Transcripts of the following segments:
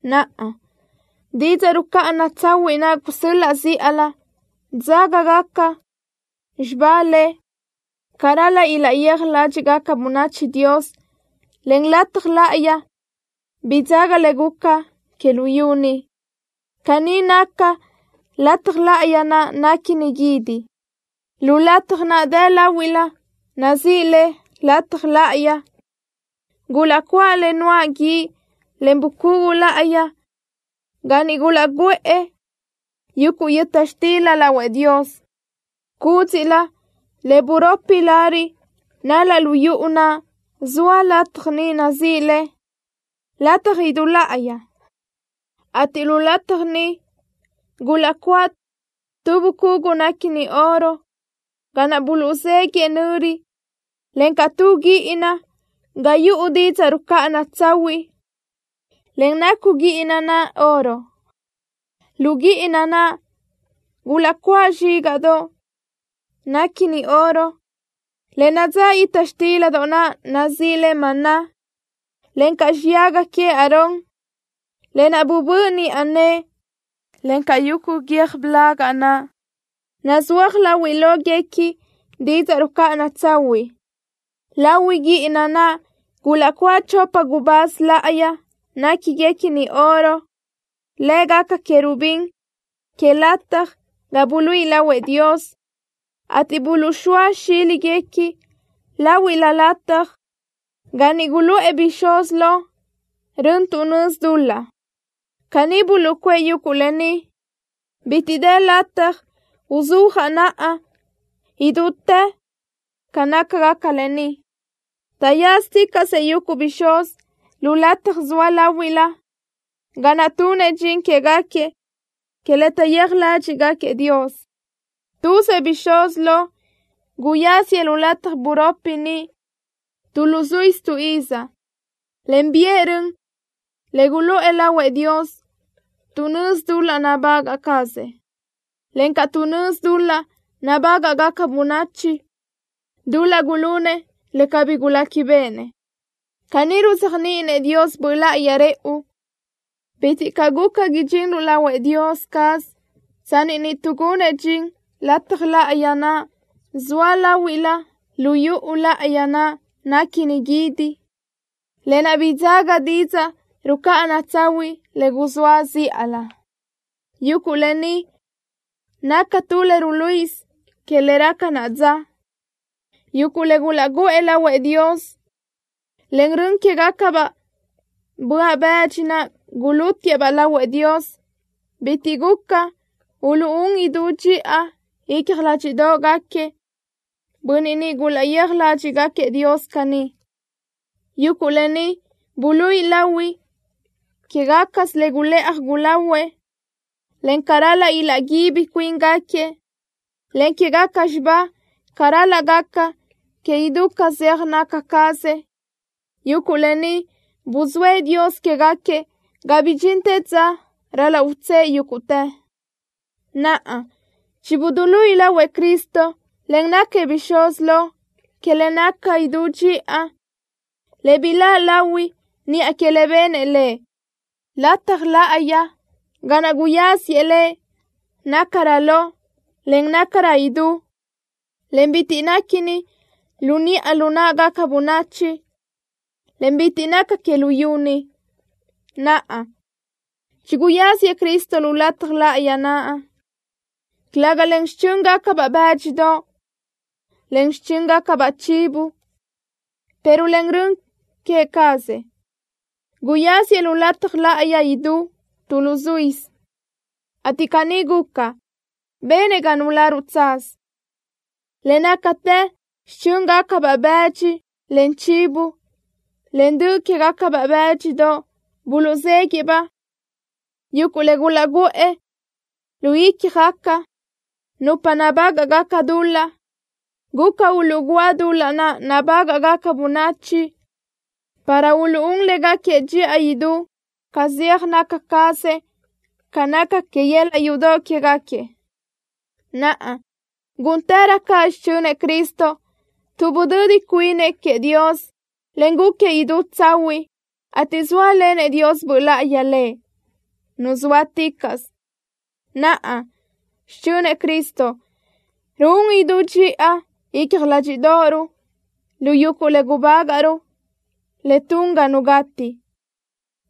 Naʼa, didzaʼ rucáʼana tsahuiʼ naʼ guzóa zíʼalö, dzágagaca xibá le ca ral-laʼ ilaʼyéaj ládxiʼgaca bönachi Dios, en lataj láʼayi bidzága le guca que luyú ni. Caní naca lataj láʼayi naʼ néquini guídi. Lu lataj naʼ dë láhuilö, nazíʼi le Lataj Láʼayi, gulaʼcuáʼ le nuáʼ guíʼ, en bucugu láʼayi ga niʼ gulaʼguʼë yuguʼ yöta xtildoʼ lahuëʼ Dios. Cúdziʼlö le buropi lariʼ nal-laʼ lu yuʼu naʼ zoa lataj niʼ nazíʼi le, Lataj Idú Láʼayi, ateʼ lu lataj niʼ gulaʼcuáʼ tu bucugu néquini oro ga naʼ buluʼzéguiʼë nöri, encaʼ tu guíʼina ga yuʼu didzaʼ rucáʼana tsahuiʼ, en nacu guíʼina naʼ oro. Lu guíʼina naʼ gulaʼcuáʼ zxígaʼdoʼ naʼ néquini oro, le nadzáʼ yöta xtildoʼ naʼ nazíʼi le maná, encaʼ xuyaga queëʼ Aarón, lë naʼ bubö́ʼ niʼa nëʼe, encaʼ yuguʼ guiö́j blaga naʼ, nazúaj láhuilöguequi didzaʼ rucáʼana tsahuiʼ. Lahui guíʼina naʼ gulaʼcuáʼ chopa gubáz láʼayi néquiguequini oro, lë́gaca querubín que lataj ga buluíʼi lahuëʼ Dios, ateʼ buluʼzxóa xíliguequi láhuilö lataj ga niʼ guluʼë bixúz lo rön tuʼ nözi dul-laʼ. Caní buluʼcuʼë yuguʼ lë ni. Bitiʼ dë lataj uzúajaʼ naʼa idútë ca nácagaca lë ni. Taʼyázaticaʼsëʼ yuguʼ bixúz lu lataj zoa láhuilö, ga naʼ tunëʼ dxin quégaquiëʼ que le taʼyéaj ládxiʼgaquiëʼ Dios. Tuzëʼ bixúz lo guyáziëʼ lu lataj buropi niʼ tu luzuísö tu iz, en biʼë rön le guluʼë lahuëʼ Dios tuʼ nözi dul-laʼ nabagaʼ cazëʼ, encaʼ tuʼ nözi dul-laʼ nabágaʼgaca bönachi, dul-laʼ gulunëʼ le cabí guléquibeʼenëʼ. Caní ruzéajniʼinëʼ Dios Böʼ Láʼayi rëʼu, bitiʼ caʼ guca idxinruʼ lahuëʼ Dios caz tsanni niʼ tuʼgunëʼ dxin lataj láʼayi naʼ zoa láhuilö lu yuʼu láʼayi naʼ néquini guídi, lë naʼ bidzága didzaʼ rucáʼana tsahuiʼ le guzóa zíʼalö. Yuguʼ lë ni naca tu le ruluíʼisö que le raca naʼa dza. Yuguʼ le gulaʼguʼë lahuëʼ Dios, en rön quégacabaʼ böaʼ bëdxi naʼ gulútiëʼ-baʼ lahuëʼ Dios bitiʼ guca uluʼún idú dxiʼa icja ládxiʼdoʼgaquiëʼ bönniʼ niʼ gulaʼyéaj ládxiʼgaquiëʼ Dios caní. Yuguʼ lë ni buluíʼi lahui quégacasö le gulëʼaj gulahuëʼ, en ca ral-laʼ ilaʼguíbi cuíngaquiëʼ, en quégaca xibá ca ral-laʼ gaca que idú ca zeaj naca cazëʼ. Yuguʼ lë ni buzóëʼ Dios quégaquiëʼ ga bidxintë dza ral-laʼ utsë́ʼë yúguʼtë. Naʼa, chibuduluíʼi lahuëʼ Cristo, en náquiëʼ Bixúz Lo que le naca idú dxiʼa, le biláʼ lahui niʼa que le benëʼ Lëʼ. Lataj láʼayi ga naʼ guyáziëʼ Lëʼ nácarö lo, en nácarö idú, en bitiʼ néquini lu niʼa lu náʼagaca bönachi, en bitiʼ naca que luyú ni. Naʼa, chiguyáziëʼ Cristo lu lataj láʼayi naʼ, calëga len xichö́ngacabaʼ bë́dxidoʼ, en xichö́ngacabaʼ chivo, pero len rön queë cazëʼ. Guyáziëʼ lu lataj idú láʼayi tu luzuísö, ateʼ caní guca, benëʼ ga nuláruʼ tsaz. Le nácatë xichö́ngacabaʼ bëdxi, en chivo, en dö queë́baʼ bë́dxidoʼ buluʼzéguiʼë-baʼ, yuguʼ le gulaʼguʼë lu ícjagaca nupa nabágaʼgaca dul-laʼ, guca uluʼgúa dul-laʼ naʼ nabágaʼgaca bönachi para uluʼún légaquiëʼ dxiʼa idú ca zeaj naca cazëʼ ca naca que yöl-laʼ yudoʼ quégaquiëʼ. Naʼa, gúntërö caʼ xichönëʼ Cristo, tuʼ budödi cuinëʼ queëʼ Dios, en gúquiëʼ idú tsahuiʼ, ateʼ zóalenëʼ Dios Böʼ Láʼayi Lëʼ, Nu zóaticaʼsö. Naʼa, xichönëʼ Cristo ruún idú dxiʼa icja ládxiʼdoʼoruʼ lu yuguʼ le gubágaʼruʼ le tun ga nu gati,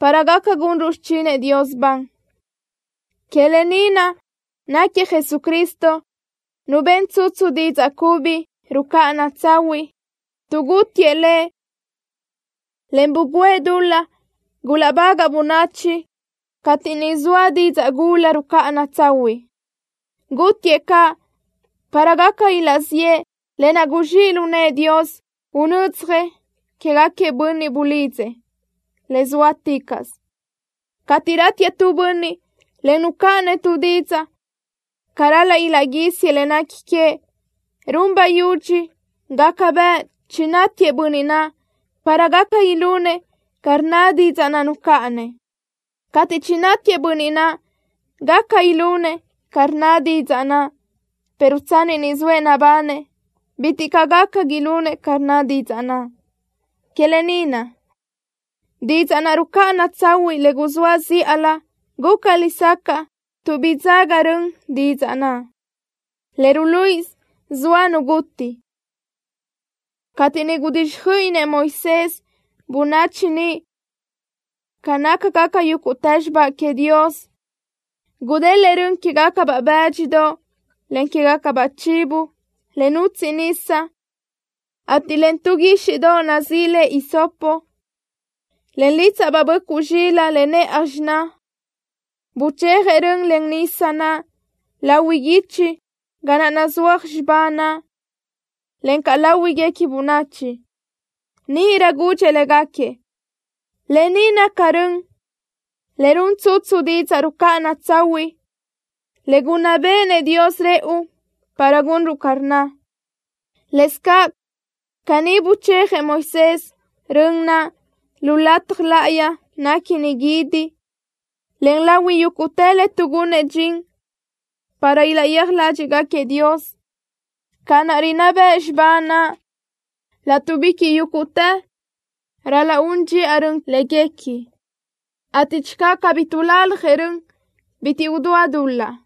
para gaca gunruʼ xichinëʼ Dios ban. Que lë ni naʼ náquiëʼ Jesucristo Nu ben tsutsu didzaʼ cubi rucáʼana tsahuiʼ, tuʼ gútiëʼ Lëʼ, en bugǘëʼ dul-laʼ gulaʼbagaʼ bönachi cateʼ niʼ zoa didzaʼ gula rucáʼana tsahuiʼ. Gútiëʼ caʼ para gaca ilaʼziʼë lë naʼ guzxíʼ lu nëʼë Dios unödzjëʼ quégaquiëʼ bönniʼ bulidzëʼ, le zóaticaʼsö. Cateʼ ratiëʼ nu bönniʼ, en nucáʼanëʼ tu didzaʼ ca ral-laʼ ilaʼguísiëʼ le nequi queëʼ, run bayudxi gaca bëʼ chinátiëʼ bönniʼ naʼ para gaca ilunëʼ ca rnna didzaʼ naʼ nucáʼanëʼ. Cateʼ chinátiëʼ bönniʼ naʼ, gaca ilunëʼ ca rnna didzaʼ naʼ, pero tsanni ni zoëʼ nabanëʼ, bitiʼ caʼ gaca ilunëʼ ca rnna didzaʼ naʼ. Que lë ni naʼ, didzaʼ naʼ rucáʼana tsahuiʼ le guzóa zíʼalö guca lesacaʼ tuʼ bidzága rön didzaʼ naʼ, le ruluíʼisö zoa nu guti. Cateʼ niʼ gudíxjöiʼinëʼ Moisés bönachi niʼ ca nácagaca yúguʼtë xibá queëʼ Dios, gudélëʼë rön quégacabaʼ bë́dxidoʼ, en quégacabaʼ chivo, le nutsiʼ nisa, ateʼ len tu guíxiʼdoʼ nazíʼi le hisopo, en lítsaʼbaʼ böʼcuʼ zxilaʼ le nëʼaj xiná, buchéajëʼ rön, en nisa naʼ lahui guichi ga naʼ nazúaj xibá naʼ, encaʼ láhuigaca bönachi. Níʼirö gudxëʼ légaquiëʼ: “Lë ni naca rön le run tsutsu didzaʼ rucáʼana tsahuiʼ le gunná béʼenëʼ Dios rëʼu para gunruʼ ca rnna.” Lëscaʼ caní buchéajëʼ Moisés rön naʼ lu lataj láʼayi néquini guídi, en lahui yúguʼtë le tuʼgunëʼ dxin para ilaʼyéaj ládxiʼgaquiëʼ Dios. Ca naʼ rinná bëʼ xibá naʼ, látuʼbiquiʼ yúguʼtë ral-laʼ un dxiʼa rön léguequi, ateʼ channö cabí tuʼlaljëʼ rön, bitiʼ udúa dul-laʼ.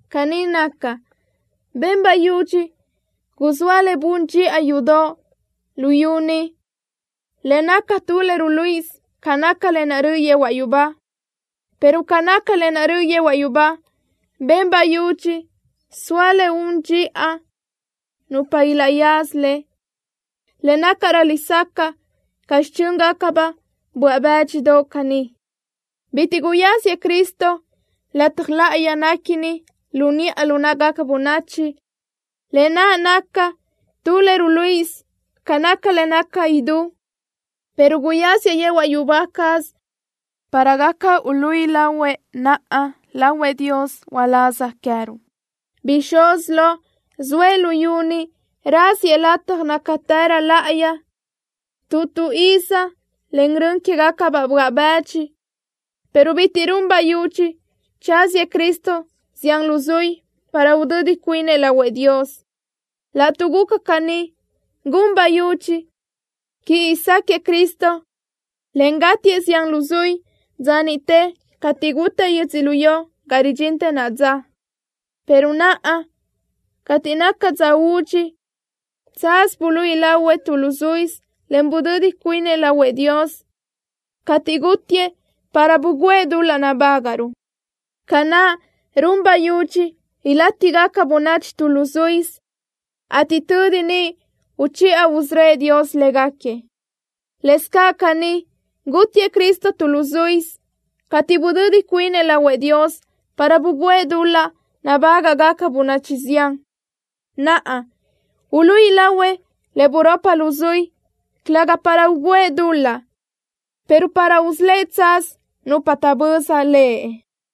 Caní naca, ben bayudxi guzóa le bun dxiʼa yudoʼ luyú ni le naca tu le ruluíʼisö ca naca lë naʼ röʼö yehuaʼ yubá, pero ca naca lë naʼ röʼö yehuaʼ yubá, ben bayudxi soa le un dxiʼa nupa ilaʼyaza le, le nácarö lesacaʼ ca xichö́ngacabaʼ böaʼ bë́dxidoʼ caní. Bitiʼ guyáziëʼ Cristo lataj láʼayi néquini lu niʼa lu náʼagaca bönachi, lë naʼ naca tu le ruluíʼisö ca naca le naca idú, pero guyáziëʼ yehuaʼ yubá caz para gaca uluíʼi lahuëʼ naʼa lahuëʼ Dios uláz queë́ruʼ. Bixúz lo zoëʼ luyú ni raziëʼ lataj nácatërö láʼayi tu tu iz len rön quégacabaʼ böaʼ bëdxi, pero bitiʼ run bayudxi tsáziëʼ Cristo zián luzuí para udödi cuinëʼ lahuëʼ Dios. Laʼtuʼ guca caní, gun bayudxi quiʼi sáquëʼë Cristo, en gátiëʼ zián luzuí dza niʼte cateʼ gutaʼ yödzölió ga ridxintë naʼa dza, pero naʼa cateʼ naca dza údxi, tsaz buluíʼi lahuëʼ tu luzuísö, en budödi cuinëʼ lahuëʼ Dios, cateʼ gútiëʼ para bugǘëʼ dul-laʼ nabágaʼruʼ. Ca naʼ run bayudxi ilátigaca bönachi tu luzuísö ateʼ tödi niʼ uchiʼa usörö́ëʼ Dios léguequi, lëscaʼ caní, gútiëʼ Cristo tu luzuísö, cateʼ budödi cuinëʼ lahuëʼ Dios para bugǘëʼ dul-laʼ nabágaʼgaca bönachi zián. Naʼa, uluíʼi lahuëʼ le buropi luzuí, calëga para ugǘëʼ dul-laʼ, pero para usölë́ʼ tsaz nupa taʼböza Lëʼ.